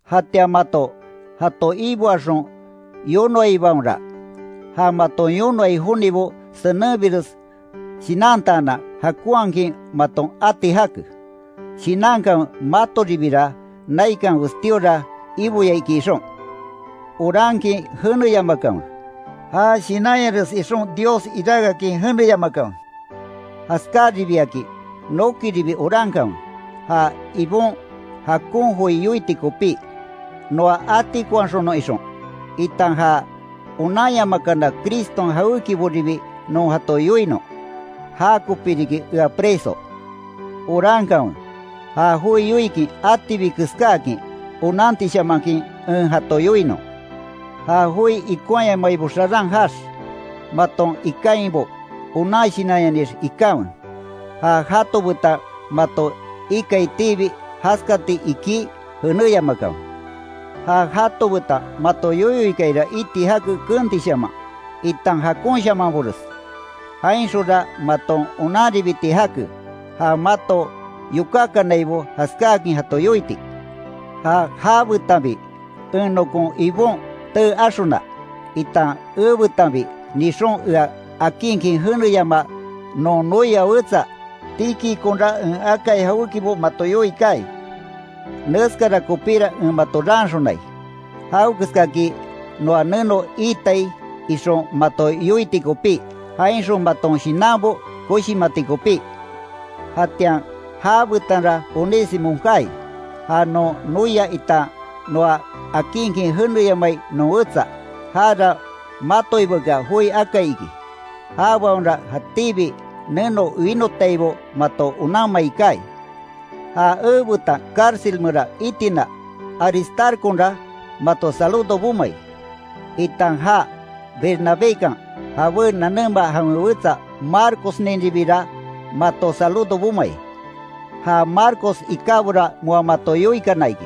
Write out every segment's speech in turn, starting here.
Jatian mato, jato iboaxon yonoaibaonra, ja maton yonoai jonibo senenbires shinantaanan jakonhakin maton ati jake; shinankanwe matoribira naikan westíora Iboya iki ixon. Orankin jeneyamakanwe, já shinanyares ixon Dios iráke akin jeneyamakanwe. Jaskáribiakin nokiribi orankanwe, ja Ibon jakon joi yoiti kopí, noa atikonhaxonon ixon, itan ja onanyamakana Criston jawékiboribi non jato yoinon. Jakopí riki ea preso. Orankanwe, ja joi yoikin atibi keskáakin, onantishamanhakin en jato yoinon. Ja joi ikonhayamaibo xaran jaax, maton ikainbo onan shinanyanix ikanwe. Ja jato betan mato ikaitibi, jaskati ikí jenéyamakanwe. Ja jato betan mato yoyo ikaira iti jake keentishaman, itan jakonshamanbores. Jainxonra maton onanribiti jake, ja mato yokákanaibo jaskáakin jato yoiti. Ja já betanbi en nokon Ibon tee axona, itan ebetanbi nixon ea akinkin jeneyamaa, non noia wetsa Tíquiconra en akai jawékibo mato yoii kaai. Neskara kopíra en mato raanxonai; jawekeskaki noa neno iitai ixon mato yoiti kopí, jainxon maton shinanbo koshimati kopí. Jatian já betanra Onésimo kaai, ja non noia itan noa akinkin jeneyamai non wetsa, jara matoibakea joi akai iki. Jabaonra jatíbi neno winotaibo mato onanmai kaai. Ja ebetan cárcel meran itina Aristarconra mato saludo bomai, itan ja Bernabékan jabé nanema jawen wetsa Marcosninribira, mato saludo bomai. Ja Marcos ikábora moa mato yoikana iki.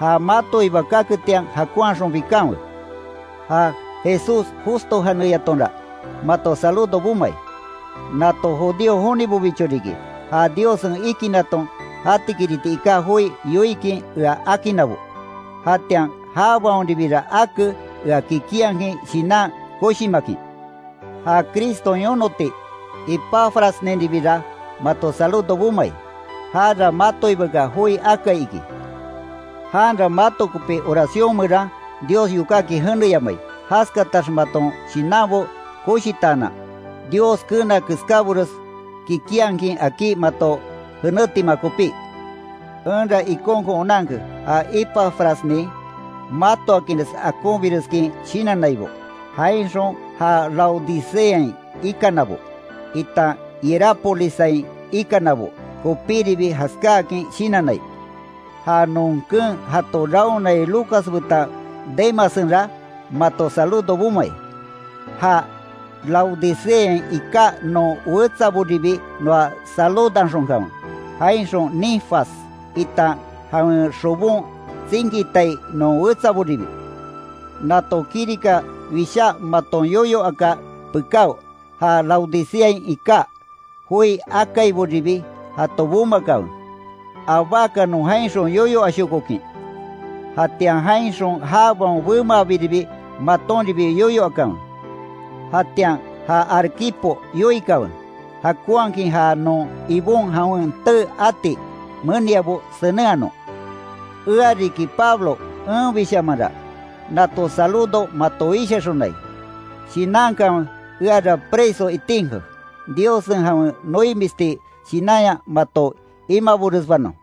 Ja matoiba kaketian jakonhaxon bikanwe. Ja Jesús Justo janeyatonra, mato saludo bomai. Nato judío jonibobicho riki, ja Diossen ikinaton jatikiriti iká joi yoikin ea akinnabo, jatian jabaonribira ake ea kikinhakin shinan koshimakin. Ja Criston yonoti Epafrasninribira mato saludo bomai, jara matoibakea joi akai iki. Janra mato kopi oración meran Dios yokákin jeneyamai, jaskatax maton shinanbo koshitaanan, Dios keena keskábores kikinhakin akí mato jenétima kopí. Enra ikonkon onanke ja Epafrasnin matoakinres akonbireskin shinannaibo, jainxon ja Laodiceain ikanabo, itan Hierápolissain ikanabo kopíribi jaskáakin shinannai Ja non keen jato raonai Lucas betan Demassenra, mato saludo bomai, ja Laodiceain iká non wetsaboribi noa saludanxonkanwe, jainxon Ninfas, itan jawen xobon tsinkitai non wetsaboribi. Nato kirika wishá maton yoyo aka pekáo, ja Laodiceain iká joi akaiboribi jato bomakanwe, abákanon jainxon yoyo ashokokin. Jatian jainxon jabaon bemaabiribi matonribi yoyo akanwe. Jatian ja Arquipo yoikanwe, jakonhakin ja non Ibon jawen tee ati meniabo senenhanon. Ea riki Pablo enbishamanra, nato saludo mato wishaxonai. Shinankanwe eara preso itinke, Diossen jawen noimisti shinanya mato imaboresbanon.